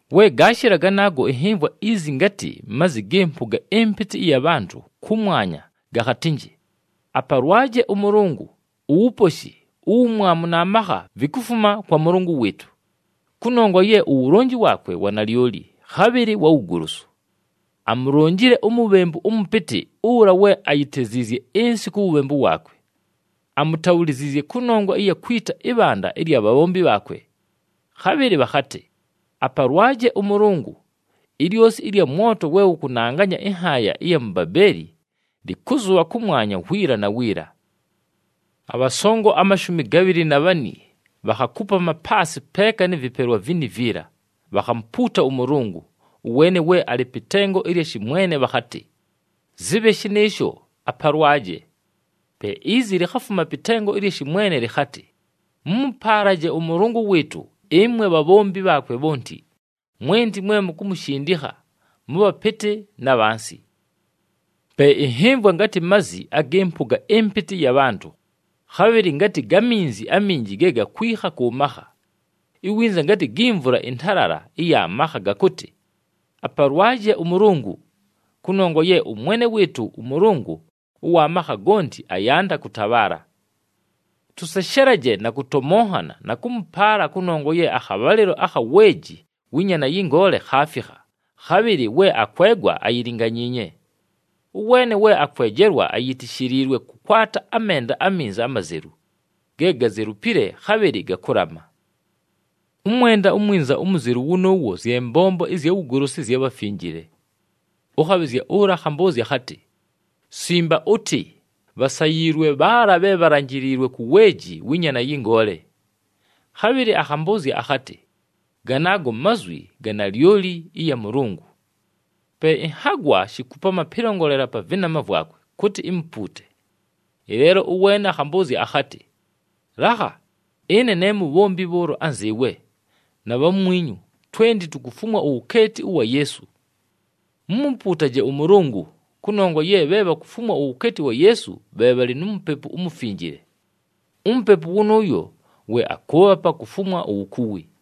We gaashɨla ganaago, ɨnhɨmvwa izi ngatɨ mazi gɨ mpʉga ɨmpɨtɨ ɨya bhantʉ kʉmwanya gakhatɨnjɨ, “Apalwaje ʉMʉlʉngʉ! Uwuposhi, uwumwamu na makha vikufuma kwa Mʉlʉngʉ wɨɨtʉ. Kʉnongwa ye uwulonji waakwe wa nalyoli, khabhɨlɨ wa wugolosu. Amulonjile umubhembu ʉmʉpɨtɨ, ʉla we ayiteziizye ɨnsɨ ku wubhembu waakwe. Amutabhuliziizye kʉnongwa ɨya kwita ɨbhanda ɨlya bhabhombi bhaakwe!” Khabhɨlɨ bhakhatɨ, “Apalwaje ʉMʉlʉngʉ! Ilyosi ɨlya mwoto we wʉkʉnanganya ɨnhaaya ɨya mu Babeeli, lɨkʉzʉbha kʉmwanya wiila na wiila!” Abhasongo amashumi gabhɨlɨ na bhani bhakhakupama paasɨ peeka nɨ vɨpelwa vini viila, bhakhamupuuta ʉMʉlʉngʉ, ʉweene we alɨ pɨ tengo ɨlya shɨmwene bhakhatɨ, “Zɨbhe shɨnɨɨsho! Apalwaje!” Pe izi likhafuma pɨ tengo ɨlya shɨmwene lɨkhatɨ, “Mʉmʉpaalaje ʉMʉlʉngʉ wɨɨtʉ, ɨmwe bhabhombi bhaakwe bhonti, mwenti mwe mukumushindikha, mʉ bhapɨtɨ na bhansi.” Pe ɨnhɨmvwa ngatɨ mazi agɨ mpʉga ɨmpɨtɨ ɨya bhantʉ, khabhɨlɨ ngatɨ ga minzi aminji ge gakwikha kʉ makha, iwinza ngatɨ gi mvula ɨntalala ɨya makha, gakʉtɨ, “Apalwaje ʉMʉlʉngʉ! Kʉnongwa ye ʉMwene wɨɨtʉ ʉMʉlʉngʉ ʉwa makha gonti ayanda kʉtabhaala! Tʉseshelaje na kʉtomonhana na kʉmʉpaala, kʉnongwa ye akhabhalɨlo akha weeji wɨ Nyaana yɨ Ngoole khaafikha, khabhɨlɨ we akwegwa ayilinganyiinye. Ʉweene we akwejelwa ayitishiliilwe kʉkwata amenda aminza amazelu, ge gazelupile, khabhɨlɨ gakʉlama.” Ʉmwenda umwinza umuzelu wʉnʉʉwo, zye mbombo ɨzya wugolosu ɨzya bhafinjile. Ʉkhabhɨzya ʉla akhambʉʉzya akhatɨ, “Simba ʉtɨ: ‘Bhasayiilwe bhaala bhe bhalanjiliilwe ku weeji wɨ Nyaana yɨ Ngoole!’” Khabhɨlɨ akhambʉʉzya akhatɨ, “Ganaago mazwi ga nalyoli ɨya Mʉlʉngʉ.” Pe ɨnhagwa shikupama pɨlongolela pa vɨnama vwakwe kʉtɨ imupuute. Ɨleelo ʉweene akhambʉʉzya akhatɨ, “Lakha! Ɨne ne mubhombi bhʉʉlo anzɨɨwe na bhamwinyu, twenti tukufumwa uwukeeti ʉwa Yeesu. Mumupuutaje ʉMʉlʉngʉ! Kʉnongwa ye bhe bhakufumwa uwukeeti wa Yeesu, bhe bhalɨ nu Mupepu uMufinjile. UMupepu wʉnʉʉyo we akʉʉbhapa kufumwa uwukuwi.”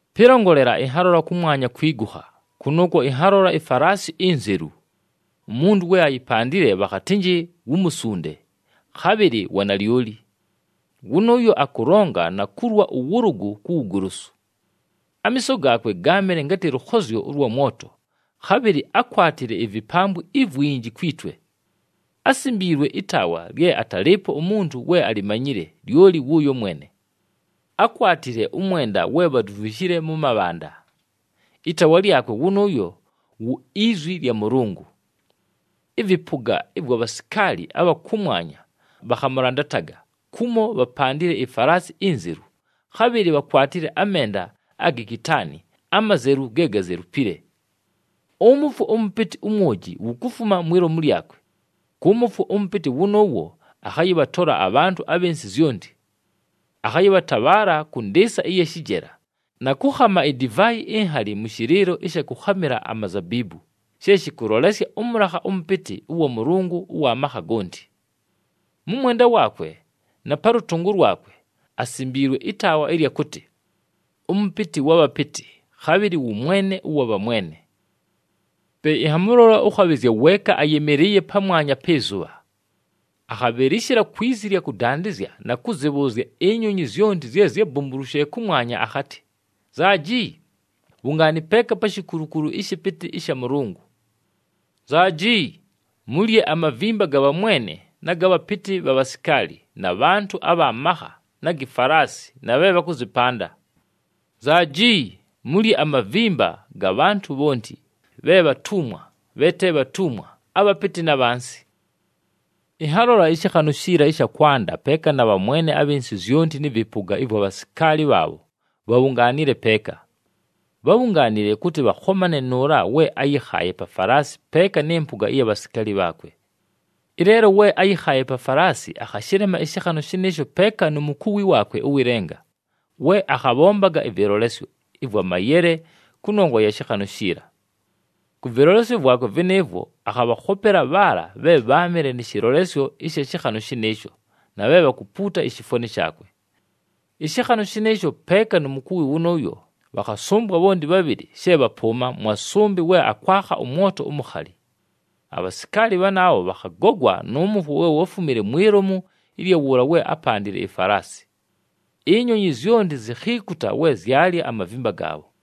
Pɨlongolela, ɨnhalola kʉmwanya kwigukha, kʉnʉʉkwo ɨnhalola ifalaasi inzelu. Umuntu we ayipandile bhakhatɨnjɨ wu “Musunde,” khabhɨlɨ “Wa Nalyoli.” Wʉnʉʉyo akʉlonga na kulwa ʉwʉlʉgʉ ku wugolosu. Amiiso gaakwe gáamɨle ngatɨ lʉkhozyo ʉlwa mwoto, khabhɨlɨ ákwatile ivipambwi ivwinji kwi twe. Ásimbiilwe ɨtaawa lye atalɨɨpo umuntu we alimanyile, lyoli wʉʉyo mwene. Ákwatile ʉmwenda we bhadumvishile mʉ mabhanda. Ɨtaawa lyakwe wʉnʉʉyo wu “IZwi lya Mʉlʉngʉ.” Ɨvɨpʉga ɨvwa bhasikaali abha kʉmwanya bhakhamʉlandataga kumo bhapandile ifalaasi inzelu, khabhɨlɨ bhakwatile amenda agi kitaani, amazelu ge gazelupile. Ʉmʉfwo ʉmʉpɨtɨ umwoji wukufuma mwi lomu lyakwe, kʉ mʉfwo ʉmʉpɨtɨ wʉnʉʉwo akhayɨbhatola abhantʉ abhɨ nsɨ zyonti. Akhayɨbhatabhaala kʉ ndɨɨsa ɨya shɨjela na kʉkhama idivaayi inhali mʉ shɨlɨɨlo ɨsha kʉkhamɨla amazabiibu, she shɨkʉlolesya ʉmʉlakha ʉmʉpɨtɨ ʉwa Mʉlʉngʉ ʉwa makha gonti. Mʉ mwenda waakwe na pa lʉtʉngʉ lwakwe asimbiilwe ɨtaawa ɨlya kʉtɨ, “ɄMʉpɨtɨ wa bhapɨtɨ, khabhɨlɨ wʉ Mwene ʉwa bhamwene.” Pe ɨnhamʉlola ʉkhabhɨzya weeka ayɨmɨlɨɨye pamwanya pɨ zʉbha. Akhabhɨlɨshɨla kwi zi ɨlya kʉdandɨzya na kʉzɨbhʉʉzya inyonyi zyonti zye zyábumbulushile kʉmwanya akhatɨ, “Nzaaji! Bhungaani peeka pa shikulukulu ɨshɨpɨtɨ ɨsha Mʉlʉngʉ. Nzaaji! Mulye amavimba ga bhamwene na ga bhapɨtɨ bha bhasikaali na bhantʉ abha makha na gi falaasi na bhe bhakʉzɨpanda. Nzaaji! Mulye amavimba ga bhantʉ bhonti, bhe bhatumwa, bhe te bhatumwa, abhapɨtɨ na bhansi.” Ɨnhalola ɨshɨkhanʉ shiila ɨsha kwanda peeka na bhamwene abhɨ nsɨ zyonti nɨ vɨpʉga ɨvwa bhasikaali bhaabho bhabhungaanile peeka. Bhábhungaanile kʉtɨ bhakhomane nʉʉla we áyɨkhaaye pa falaasi peeka nɨ mpʉga ɨya bhasikaali bhaakwe. Ɨleelo we áyɨkhaaye pa falaasi akhashɨlema ɨshɨkhanʉ shɨnɨɨsho peeka nu mukuwi waakwe ʉwɨ lenga, we akhabhombaga ɨvɨlolesyo ɨvwa mayele kʉnongwa ya shɨkhanʉ shiila. Kʉ vɨlolesyo vwakwe vɨnɨɨvwo, akhabhakhopela bhaala bhe bháamɨle nɨ shɨlolesyo ɨsha shɨkhanʉ shɨnɨɨsho, na bhe bhakupuuta ishifwani shaakwe. Ɨshɨkhanʉ shɨnɨɨsho peeka nu mukuwi wʉnʉʉyo, bhakhasʉmbwa bhonti bhabhɨlɨ she bhapʉʉma, mwa sʉmbɨ we akwakha ʉmwoto umukhali. Abhasikaali bhaabho bhakhagogwa nʉ mʉfwo we wáfumile mwi lomu ɨlya wʉʉla we ápandile ifalaasi. Inyonyi zyonti zikhiikuta we zyalya amavimba gaabho.